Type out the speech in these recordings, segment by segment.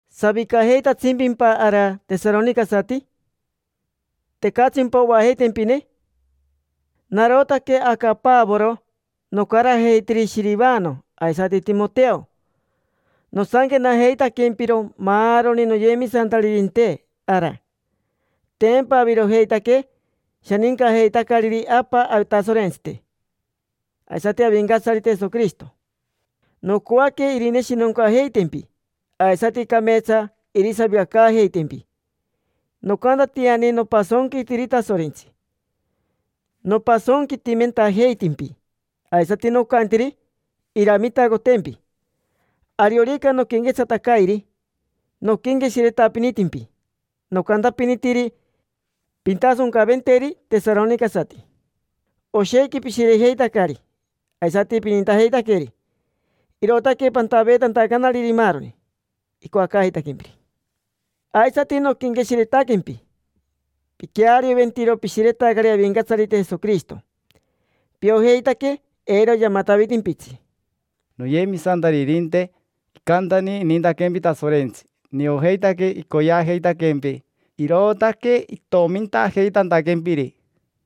¿Savicajeitatsimpimpa ara, tesaronicasati? ¿Tecatsimpa oajeitempine? Narotaque aca Pavoro, nocarajeitiri Shirivano aisati Timoteo. Nosanquenajeitaquempiro maaroni noyemisantaririnte ara. Tempa avirojeitaque shanincajeitacariri Apa Atasorentsite aisati Avincatsarite Jesoquirishito. Nocoaque irineshinoncajeitempi aisati cameetsa irisavicacaajeitempi. Nocantatiani nopasonquitiri Tasorentsi: nopasonquitimentajeitimpi aisati nocantiri iramitacotempi. Ariorica noquenquetsatacairi, noquenqueshiretapinitimpi, nocantapinitiri: “Pintasoncaventeri tesaronicasati”. Oshequi pishirejeitacari aisati pinintajeitaqueri, irootaque pantaveetantacanariri maaroni icoacaajeitaquempiri. Aisati noquenqueshiretaquempi, piquearioventiro pishiretacari Avincatsarite Jesoquirishito, piojeitaque eiro yamatavitimpitsi. Noyemisantaririnte, icantani inintaquempi Tasorentsi. Niojeitaque icoyeajeitaquempi, irootaque itomintajeitantaquempiri.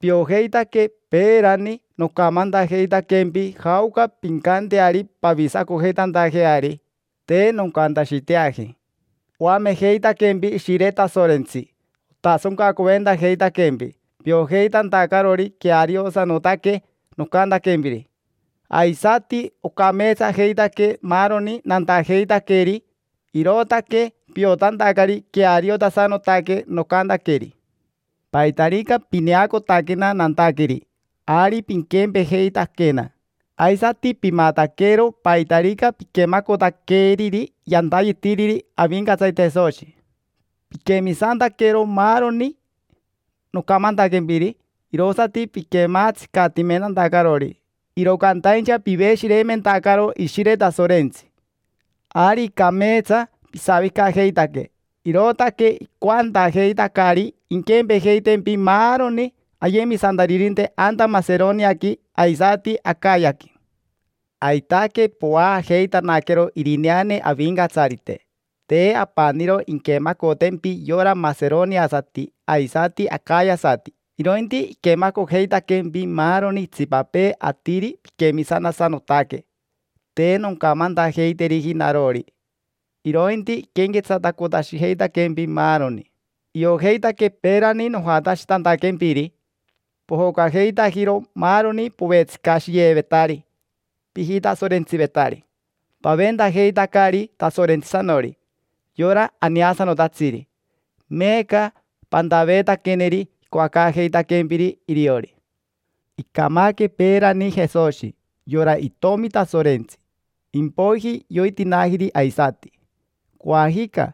Piojeitaque peerani nocamantajeitaquempi jaoca pincanteari pavisacojeitantajeari; te noncantashiteaji. Oamejeitaquempi Ishire Tasorentsi, otasoncacoventajeitaquempi, piojeitantacarori queariosanotaque nocantaquempiri. Aisati ocameetsajeitaque maaroni nantajeitaqueri, irootaque piotantacari queariotasanotaque nocantaqueri. Paitarica pineacotaquena nantaqueri, ari piquempejeitaquena. Aisati pimataquero paitarica piquemacotaqueriri yantayetiri Avincatsarite Jesoshi. Piquemisantaquero maaroni nocamantaquempiri, irosati piquemaatsicatimentantacarori, iro cantaincha piveshireimentacaro Ishire Tasorentsi. Ari cameetsa pisavicajeitaque, irootaque icoantajeitacari inquempejeitempi maaroni ayemisantaririnte anta Maseroniaqui aisati Acayaqui. Aitaque povaajeitanaquero Irineane Avincatsarite. Te apaniro inquemacotempi yora maseroniasati aisati acayasati, irointi iquemacojeitaquempi maaroni itsipapee atiri piquemisantasanotaque. Te noncamantajeiteriji narori, irointi iquenquetsatacotashijeitaquempi maaroni. Iojeitaque peerani nojatashitantaquempiri, pojocajeitajiro maaroni povetsicashiyevetari pijitasorentsivetari. Paventajeitacari Tasorentsisanori, yora aneasanotatsiri; meeca pantaveetaqueneri icoacaajeitaquempiri iriori. Icamaque peerani Jesoshi, yora Itomi Tasorentsi, impoiji yoitinaajiri aisati. Coajica,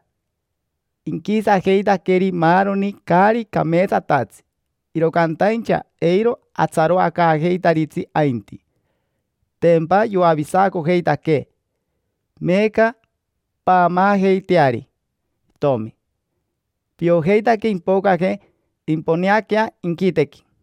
inquisajeitaqueri maaroni caari cameetsatatsi, iro cantaincha eiro atsaroacaajeitaritsi ainti: tempa yoavisacojeitaquee. Meeca paamaajeiteari Itomi: piojeitaque impocaje, imponeaquea inquitequi.